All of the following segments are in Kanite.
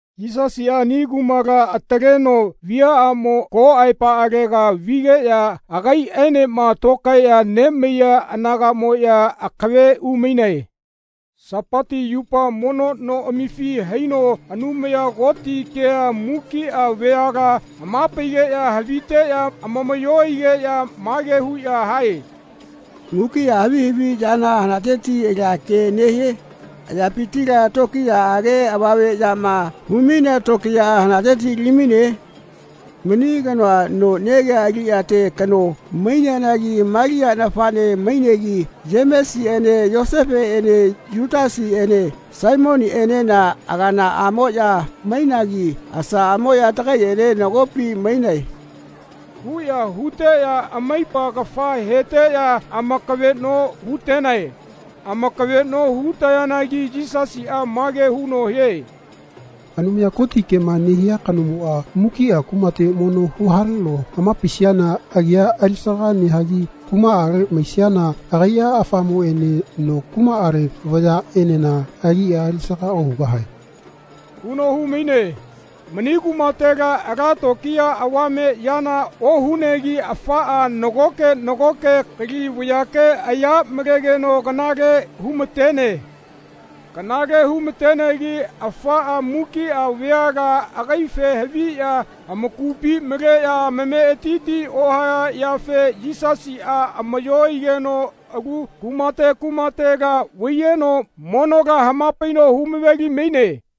Yisasiꞌa ani kumala ataleno viaꞌamo ko aepaꞌalega vigeꞌya agaiꞌaenema tokaeꞌya nemaiya anagaꞌmoꞌya akave umainae. Sapati yupa mono noꞌamifi haino Anumaya Koti kea mukiꞌa vayala hamapaigeꞌya haviteꞌya amamaꞌyo aigeꞌya mage huꞌya hae “Mukiꞌa havi haviꞌyana hanateti alia kea nehie? Ayapitila tokiyaꞌage avame yama humainea tokiyaꞌa hanateti alimaine? Mani kanoa no negia aliꞌyate kano maineanagi Malia nafaꞌne mainegi Yemesiꞌene Yoseseꞌene Yutasiꞌene Saimoniꞌenena aganaꞌamoꞌya mainagi asaꞌamoꞌya tagaiꞌene nagopi mainae.” huꞌya huteꞌya amaipa kafa heteꞌya amakaveꞌno hutenae. Amakaveꞌno hutayanagi Yisasiꞌa mage huno hie “Anumaya Koti kema nehia kanomoꞌa mukiꞌa kumate mono huhaleno hamapaisiana agia alisaga nehagi kumaꞌale maisiana agaiꞌa afamoꞌene no kumaꞌale vayaꞌenena agia alisaga ohugahae.” huno humaine. Mani kumatela ala tokiya avame yana ohunegi afaꞌa nagoke nagoke kali vayake aya malegeno kanale humatene. Kanale humatenegi afaꞌa mukiꞌa veala agaife haviꞌya amakupi maleꞌya amametiti ohaya yafe Yisasiꞌa amaꞌyo aigeno alu kumate kumatela vaiyeno monola hamapaino humaveli maine.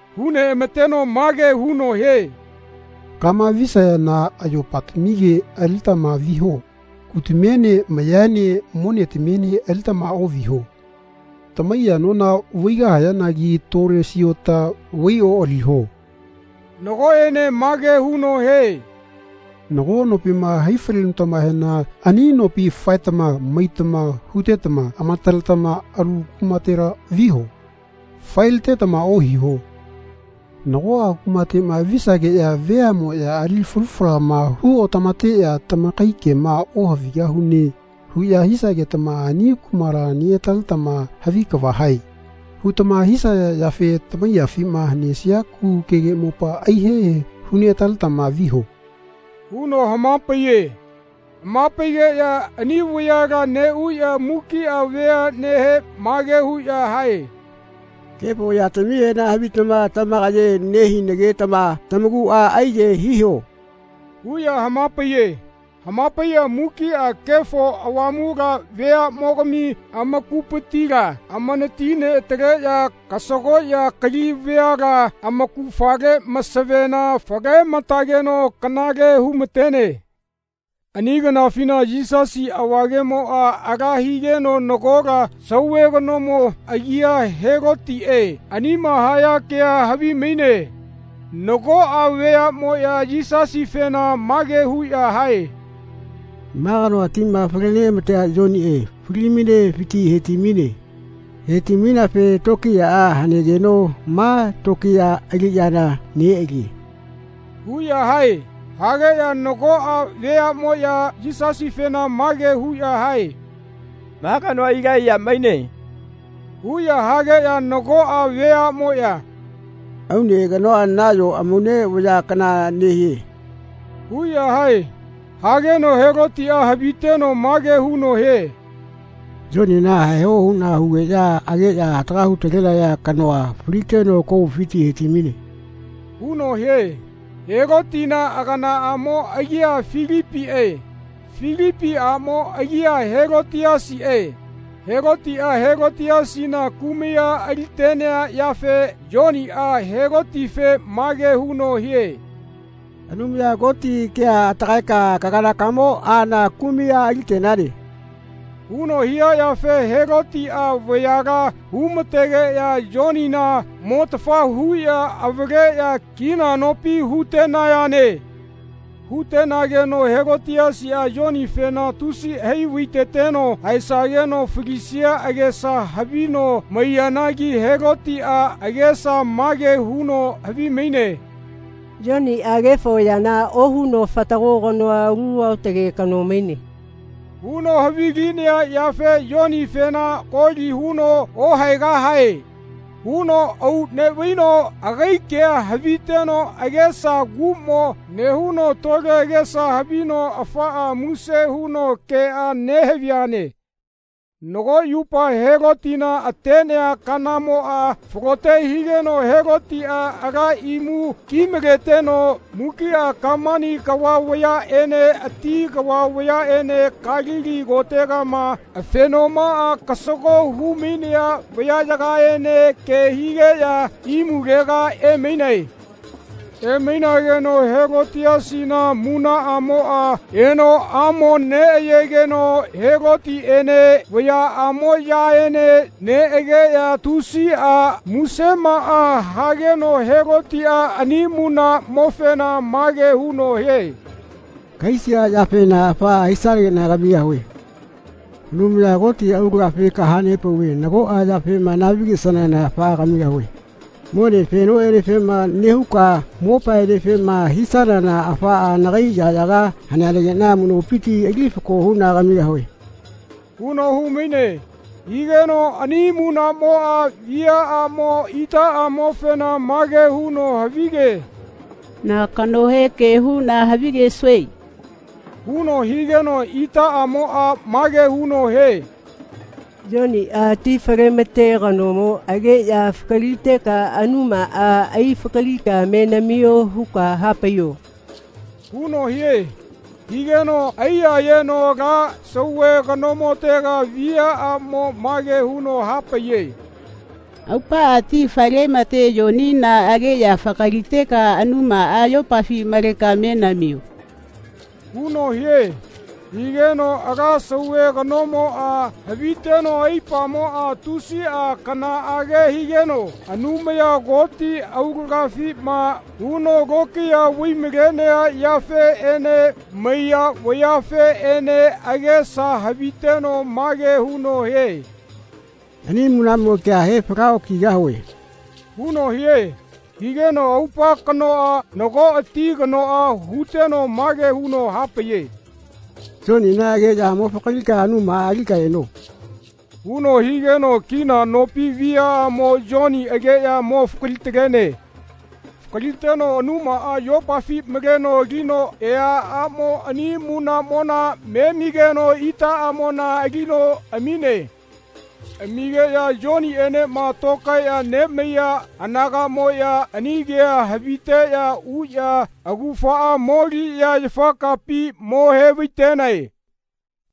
Huneꞌamateno mage huno hie “Kama visayana ayopatamige alilitama viho. Kutamiene mayaene monetamiene alitama oꞌviho. Tamaiya nona vaigahayanaki tole siota vaioꞌaliho.” Nagoꞌene mage huno hie “Nago nopima haifalenutamahena ani nopi faetama maitama hutetama amataletama alu kumatela viho. Faelitetama ohiho. Nagoꞌa kumateꞌma visageꞌya veaꞌmoꞌya ali falu falama huotamateꞌya ‘Tamakai kema ohavigahune.’ huꞌya hisagetama ani kumala neꞌataletama ‘Havi kava hae.’ hutama hisaya yafe tamaiyafima hanesia kugukege mopa aihehe huneꞌataletama viho.” huno hamapaiye. Hamapaigeꞌya ani vayala neꞌuꞌya mukiꞌa veaꞌnehe mage huꞌya hae “Kefo yatamihena havitama tamakaye nehinagetama tamakuꞌa aiyahae hiho.” huꞌya hamapaiye. Hamapaiꞌya mukiꞌa Kefo Avamula veaꞌmogami amakupitila amanati neꞌataleꞌya kasagoꞌya kali veala amaugafale masavena falematageno kanale humatene. Ani kanafina Yisasi avagemoꞌa ala higeno nagola sauve kanomo agia Helotiꞌe anima haya kea havimaine. Nagoꞌa veaꞌmoꞌya Yisasifena mage huꞌya hae “Ma kanoa tima falematea Yoniꞌe falimainefiti hetimaine. Hetimaineafe tokiyaꞌa hanegeno ma tokiya aliꞌyana neꞌalie.” huꞌya hae. Hageꞌya nagoꞌa veaꞌmoꞌya Yisasifena mage huꞌya hae “Ma kanoa Ilaiya maine.” huꞌya hageꞌya nagoꞌa veaꞌmoꞌya “Aune kanoa nayo amaune vaya kana nehie.” huꞌya hae. Hageno Helotiꞌa haviteno mage huno hie “Yonina haeho huꞌna hugeꞌya ageꞌya hataga hutalenaya kanoa faliteno komufiti hetimaine.” huno hie. Helotina aganaꞌamo agia Filipiꞌe. Filipi aꞌmo agia Helotiasiꞌe. Helotiꞌa Helotiasina kumai a alitenea yafe Yoniꞌa Helotife mage huno hie “Anumaya Koti kea atagaeka kaganakamo aala kumai a alitenane.” huno hia yafe Helotiꞌa vayala humategeꞌya Yonina motafa huꞌya avaleꞌya kina nopi hutenayane. Hutenageno Helotiasiꞌa Yonifena tusi hai vaiteteno haesageno falisia agesa havino maiyanagi Helotiꞌa agesa mage huno havimaine “Yoniꞌa kefo yana ohuno fatago kanoa alu aotage kano maine.” huno havilinea yafe Yonifena koli huno “Ohaegahae.” huno auꞌneꞌvaino agai kea haviteno agesa kuꞌmo nehuno tole agesa havino afaꞌa muse huno keꞌa nehaviane. Nago yupa Helotina atenea kanamoꞌa falote higeno Helotiꞌa ala imu kimaleteno mukiꞌa kamani kava vayaꞌene ati kava vayaꞌene Kalili kotegama afenomaꞌa kasago humainea vayaꞌyagaene ke higeꞌya imulega emainae. Emainageno Helotiasina munaꞌamoꞌa eno amoneꞌayegeno Helotiꞌene vayaꞌamoꞌyaene neꞌageꞌya tusiꞌa musemaꞌa hageno Helotiꞌa ani munaꞌmofena mage huno hie “Kahaisia yafena afaꞌa hisanageꞌna kamigahue. Anumaya Koti aulagafi kahanepauve nagoꞌa yafema nahavigesanana afaꞌa kamigahue. Mone fenoꞌenefema nehuka mopaenefema hisanana afaꞌa nagai yaꞌyaga haneanagiꞌna amuꞌnopiti ali fako huꞌna kamigahue.” huno humaine. Higeno ani munaꞌmoꞌa viaꞌamo itaꞌamofena mage huno havige “Na kanohe ke huꞌna havigesue?” huno higeno itaꞌamoꞌa mage huno hie “Yoniꞌa ti falemate kanomo ageꞌya fakaliteka anumaꞌa aifakalika me namio huka hapaiyo.” huno hie. Higeno aiyayeno ala sauve kanomotega viaꞌamo mage huno hapaiye “Aupaꞌa ti falemate Yonina ageꞌya fakaliteka anumaꞌa yopafi maleka me namio.” huno hie. Higeno ala sauve kanomoꞌa haviteno aipamoꞌa tusiꞌa kanaꞌage higeno Anumaya Koti aulagafima huno lokiya vaimalea yafeꞌene maiya vayafeꞌene agesa haviteno mage huno hie “Ani munaꞌmo kea he falaꞌokigahue.” huno hie. Higeno aupa kanoꞌa nago ati kanoꞌa huteno mage huno hapaiye “Yonina ageꞌya mo fakalika anumaꞌa alika eno.” huno higeno kina nopi viaꞌamo Yoni ageꞌya mo fakalitalene. Fakaliteno anumaꞌa yopafi maleno alino eaꞌamo ani munaꞌmona memigeno itaꞌamona alino amine. Amigeꞌya Yoniꞌenema tokaeꞌya nemaiya anagaꞌmoꞌya ani kea haviteꞌya uꞌya augafaꞌa moliꞌya yafakapi mo hevaitenae.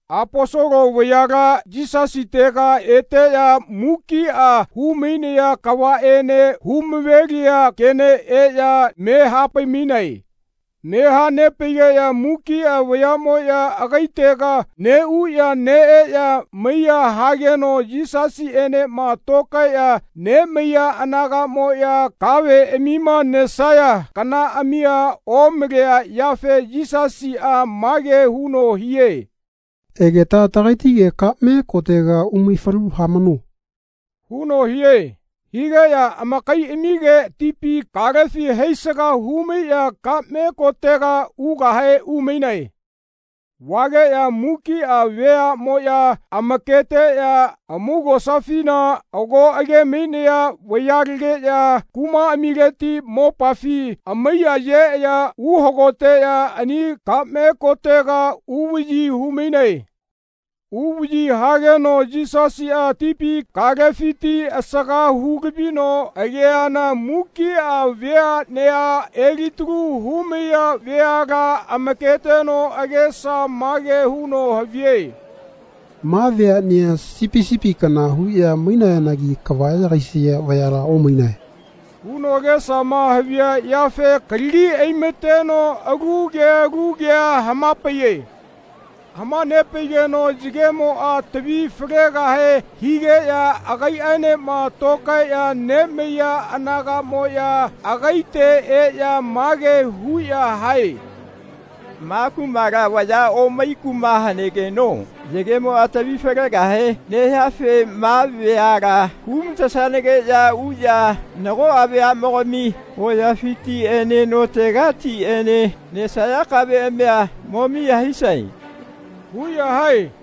Aposolo vayala Yisasitega eteꞌya mukiꞌa humainaya kavaꞌene humaveliya kene eꞌya me hapaimainae. Me hanepaigeꞌya mukiꞌa veaꞌmoꞌya agaitega neꞌuꞌya neꞌeꞌya maiꞌya hageno Yisasiꞌenema tokaeꞌya nemaiya anagaꞌmoꞌya kaveꞌamima nesaya kanaꞌamia omalea yafe Yisasiꞌa mage huno hie “Egeta tagaitige kaꞌme kotega umaifalu hamano.” huno hie. Higeꞌya amakaiꞌamige tipi kalefi haisaga humaiꞌya kaꞌme kotega ugahe umainae. Vageꞌya mukiꞌa veaꞌmoꞌya amaketeꞌya amaugosafina ago agemainaya vayalegiꞌya kumaꞌamileti mopafi amaiya yeꞌya uhagoteꞌya ani kaꞌme kotega uvaꞌyi humainae. Uvaꞌyi hageno Yisasiꞌa tipi kalefiti asaga hulavino ageana mukiꞌa veaꞌnea elitalu humaiya veala amaketeno agesa mage huno havie “Ma veaꞌnea sipi sipi kana huꞌya mainayanagi kava yagaisaya vayala omainae.” huno agesama havia yafe kalagi aimateno alu ke alu kea hamapaiye. Hamanepaigeno yagemoꞌa tavi falegahe higeꞌya agaiꞌaenema tokaeꞌya nemaiya anagaꞌmoꞌya agaite eꞌya mage huꞌya hae “Ma kumala vaya omai kuma hanegeno yagemoꞌa tavi falegahe nehiafe ma veala humatesanageꞌya uꞌya nagoꞌa veaꞌmogami hoyafitiꞌene notegatiꞌene nesaya kaveꞌamia mo miya hisae.” huꞌya hae.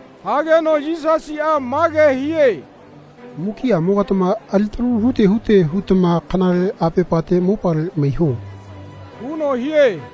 Hageno Yisasiꞌa mage hie “Mukiꞌamogatama alitalu hute hute hutama kanale apepate mopale maiho.” huno hie.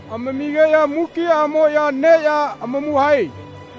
Amamigeꞌya mukiꞌamoꞌya neꞌya amamu hae.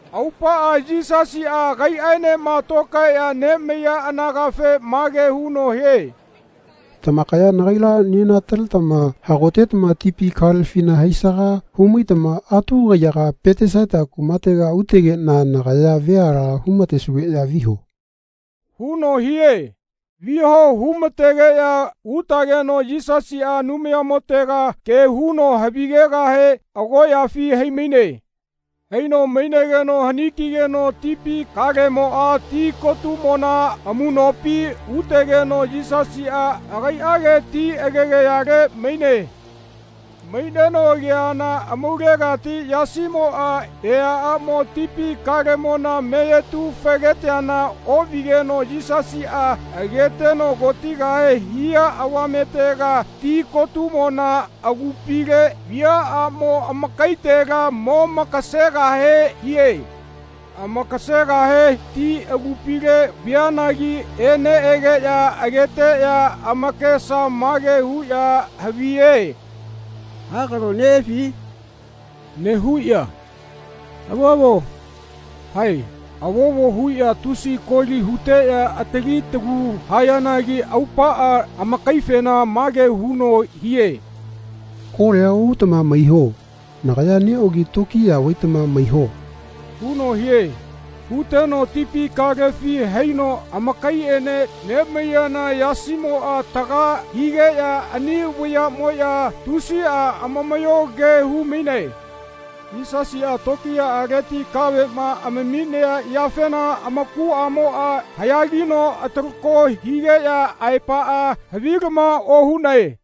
Aupaꞌa Yisasiꞌa agaiꞌaenema tokaeꞌya nemaiya anagafe mage huno hie “Tamakaya nagaila nenataletama hagotetama tipi kalefina haisaga humaitama atu kaiyaga Petesaita kumatega utegeꞌna nagaya veala humatesugeꞌya viho.” huno hie. Viho humategeꞌya utageno Yisasiꞌa Anumayamotega ke huno havigegahe agoꞌyafi haimaine. Haino mainegeno hanikigeno tipi kalemoꞌa tikotumona amuꞌnopi utegeno Yisasiꞌa agaiꞌage ti agegayale maine. Maineno ageana amaulegati yasimoꞌa eaꞌamo tipi kalemona meyetu fegeteana oꞌvigeno Yisasiꞌa ageteno kotigahe hia avametega ti kotumona agupile viaꞌamo amakaitela momakasegahe hie. Amakasegahe ti agupile vianagi eneꞌegeꞌya ageteꞌya amakesa mage huꞌya haviye “Hakalo neꞌefi?” nehuꞌya “Avovo.” hae Avovo huꞌya tusiꞌa koli huteꞌya atali talu hayanagi aupaꞌa amakaifena mage huno hie “Kolia ohutama maiho. Nagaya neꞌogi tokiya vaitama maiho.” huno hie. Huteno tipi kalefi haino amakaiꞌene nemaiyana yasimoꞌa taga higeꞌya ani vayaꞌmoꞌya tusiꞌa amamaꞌyoge humainae. Yisasiꞌa tokiyaꞌaleti kaveꞌma amaminea yafena amakuꞌamoꞌa haꞌyagino atalako higeꞌya aepaꞌa havilama ohunae.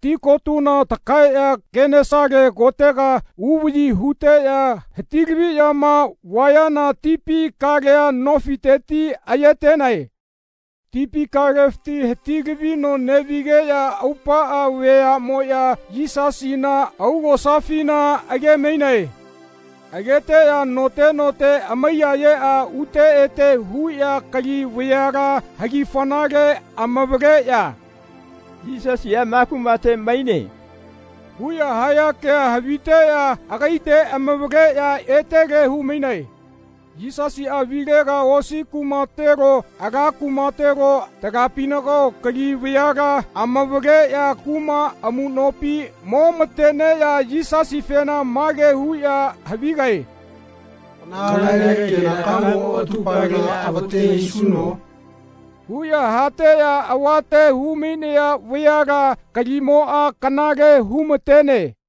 Ti kotuna takaeꞌya Kenesale kotega uvaꞌyi huteꞌya hatilaviꞌyama vayana tipi kalea nofiteti ayetenae. Tipi kalefiti hatilavino neꞌvigeꞌya aupaꞌa veaꞌmoꞌya Yisasina augosafina agemainae. Ageteꞌya note note amaiyayeꞌya ute ete huꞌya kali veala hagifanale amavaleꞌya “Yisasiꞌa ma kumate maine.” huꞌya haya kea haviteꞌya agaite amavaleꞌya etele humainae. Yisasiꞌa vilega osi kumatelo ala kumatelo talapinagao kali veala amavaleꞌya kuma amuꞌnopi momateneꞌya Yisasifena mage huꞌya havigae “Kanale kenakamo atupalela avate hisuno?” huꞌya hateꞌya avate humainaya veala kalimoꞌa kanale humatene.